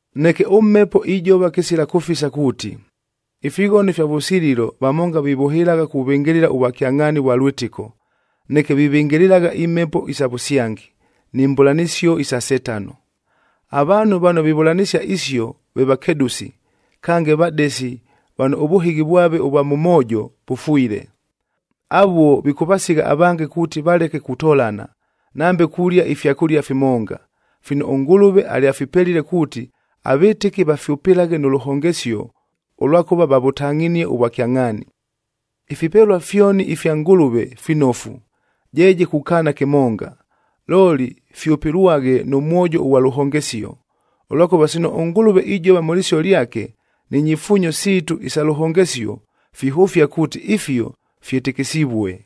Neke ʉMhepo ijova kɨsila kʉfisa kuuti, ifighono ifya vʉsililo vamonga vivʉhɨlagha kuvɨngɨlɨla ʉvwakyangʼhaani vwa lwɨtɨko, neke vivɨngɨlɨlagha imhepo isa vʉsyangi, ni mbʉlanɨsio isa Setano. Avaanhu vano vivʉlanɨsia isio ve vakedʉsi, kange vadesi vano ʉvʉhɨghi vwave ʉvwa mʉ moojo vʉfwile. Avuo vikʉvasigha avange kuuti valeke kutolana, nambe kulia ifyakʉlia fimonga, fino ʉNgʉlʉve alyafipelile kuuti, avɨtɨki vafyʉpɨlaghe nʉ lʉhongesio, ʉlwakʉva vavʉtangʼhinie ʉvwakyangʼhaani. Ifipelua fyoni ifya Ngʉlʉve finofu, jeeje kukaana kɨmonga, looli fyʉpɨlwaghe nʉ mwojo ʉghwa lʉhongesio. Ʉlwakʉva sino ʉNgʉlʉve ijova mʉ lɨsio lyake, ni nyifuunyo siitu isa lʉhongesio, fihʉfia kuuti ifio fyɨtɨkɨsivue.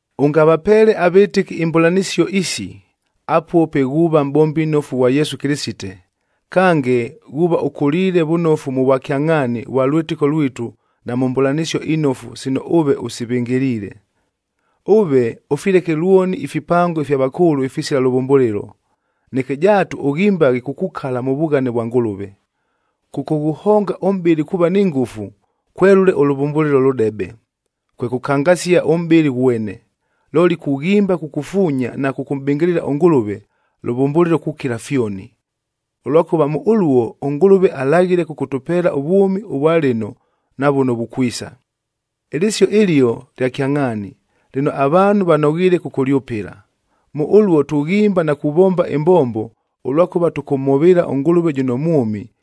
Ʉngavapeele avɨtɨki imbʉlanɨsio isi, apuo pe ghuuva mʼbombi nnofu ghwa Yesu Kɨlɨsite, kange ghuuva ʉkʉliile vʉnofu mʉ vwakyangʼhaani vwa lwɨtɨko lwitu na mʉ mbʉlanɨsio inofu sino ʉve ʉsivɨngɨliile. Ʉve ʉfileke lwoni ifipango ifya vakʉʉlʉ ifisila lʉvʉmbʉlɨlo, neke jaatu ʉghimbaghe kukukala mʉ vughane vwa Ngʉlʉve. “Kʉkʉghʉhonga ʉmʼbɨlɨ kuuva ni ngʉfu, kwelʉle ʉlʉvʉmbʉlɨlo lʉdebe, kwe kʉkangasia ʉmʼbɨlɨ ghwene. Looli, kughimba kukufuunya na kʉkʉmʼbɨngɨlɨla ʉNgʉlʉve, lʉvʉmbʉlɨlo kukila fyoni. Ʉlwakʉva mʉ ʉluo ʉNgʉlʉve alaghile kʉkʉtʉpeela ʉvwʉmi ʉvwa lɨno na vʉno vukwisa.” Ɨlɨsio ɨlio lya kyangʼhaani, lɨno avaanhu vanoghiile kʉkʉlyʉpɨla. Mʉ ʉluo tughimba na kuvomba ɨmbombo, ʉlwakʉva tʉkʉmhʉvɨɨla ʉNgʉlʉve jʉno mwʉmi,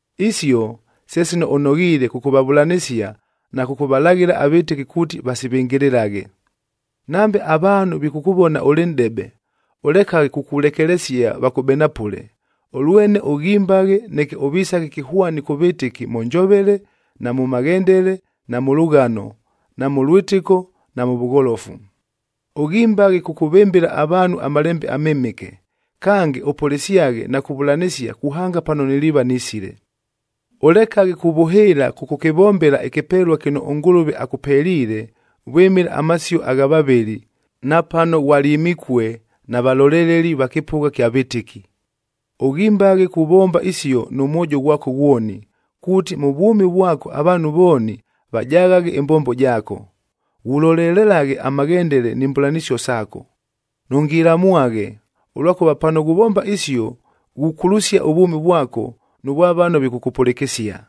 Isio se sino ʉnoghiile kʉkʉvavʉlanɨsia na kʉkʉvalaghɨla avɨtɨki kuuti vasivɨngɨlɨlaghe. Nambe avaanhu vikʉkʉvona ʉlɨ nʼdebe, ʉlekaghe kukulekelesia vakʉbenapʉle, ʉlwene ʉghimbaghe neke ʉvisaghe kɨhwani kʉ vɨtɨki mʉ njovele, na mʉ maghendele, na mʉ lʉghano, na mʉ lwɨtɨko na mʉ vʉgholofu. Ʉghimbaghe kʉkʉvɨmbɨla avaanhu aMalembe aMɨmɨke, kange ʉpʉlɨsyaghe na kuvʉlanɨsia kuhanga pano niliiva nisile. Ʉlekaghe kuvʉhɨɨla kʉkʉkɨvombela ɨkɨpelua kɨno ʉNgʉlʉve akʉpeliile vwɨmɨla amasio agha vavɨli, na pano ghwalyɨmikue na valoleleli va kɨpʉgha kya vɨtɨki. Ʉghimbaghe kuvomba isio nʉ mwojo ghwako ghwoni, kuuti mʉ vwʉmi vwako avaanhu vooni vajaghaghe ɨmbombo jaako. Ghulolelelaghe amaghendele ni mbʉlanɨsio saako. Nʉngilamwaghe, ʉlwakʉva pano ghuvomba isio ghukulusia ʉvwʉmi vwako nʉ vwa vano vikʉkʉpʉlɨkɨsia.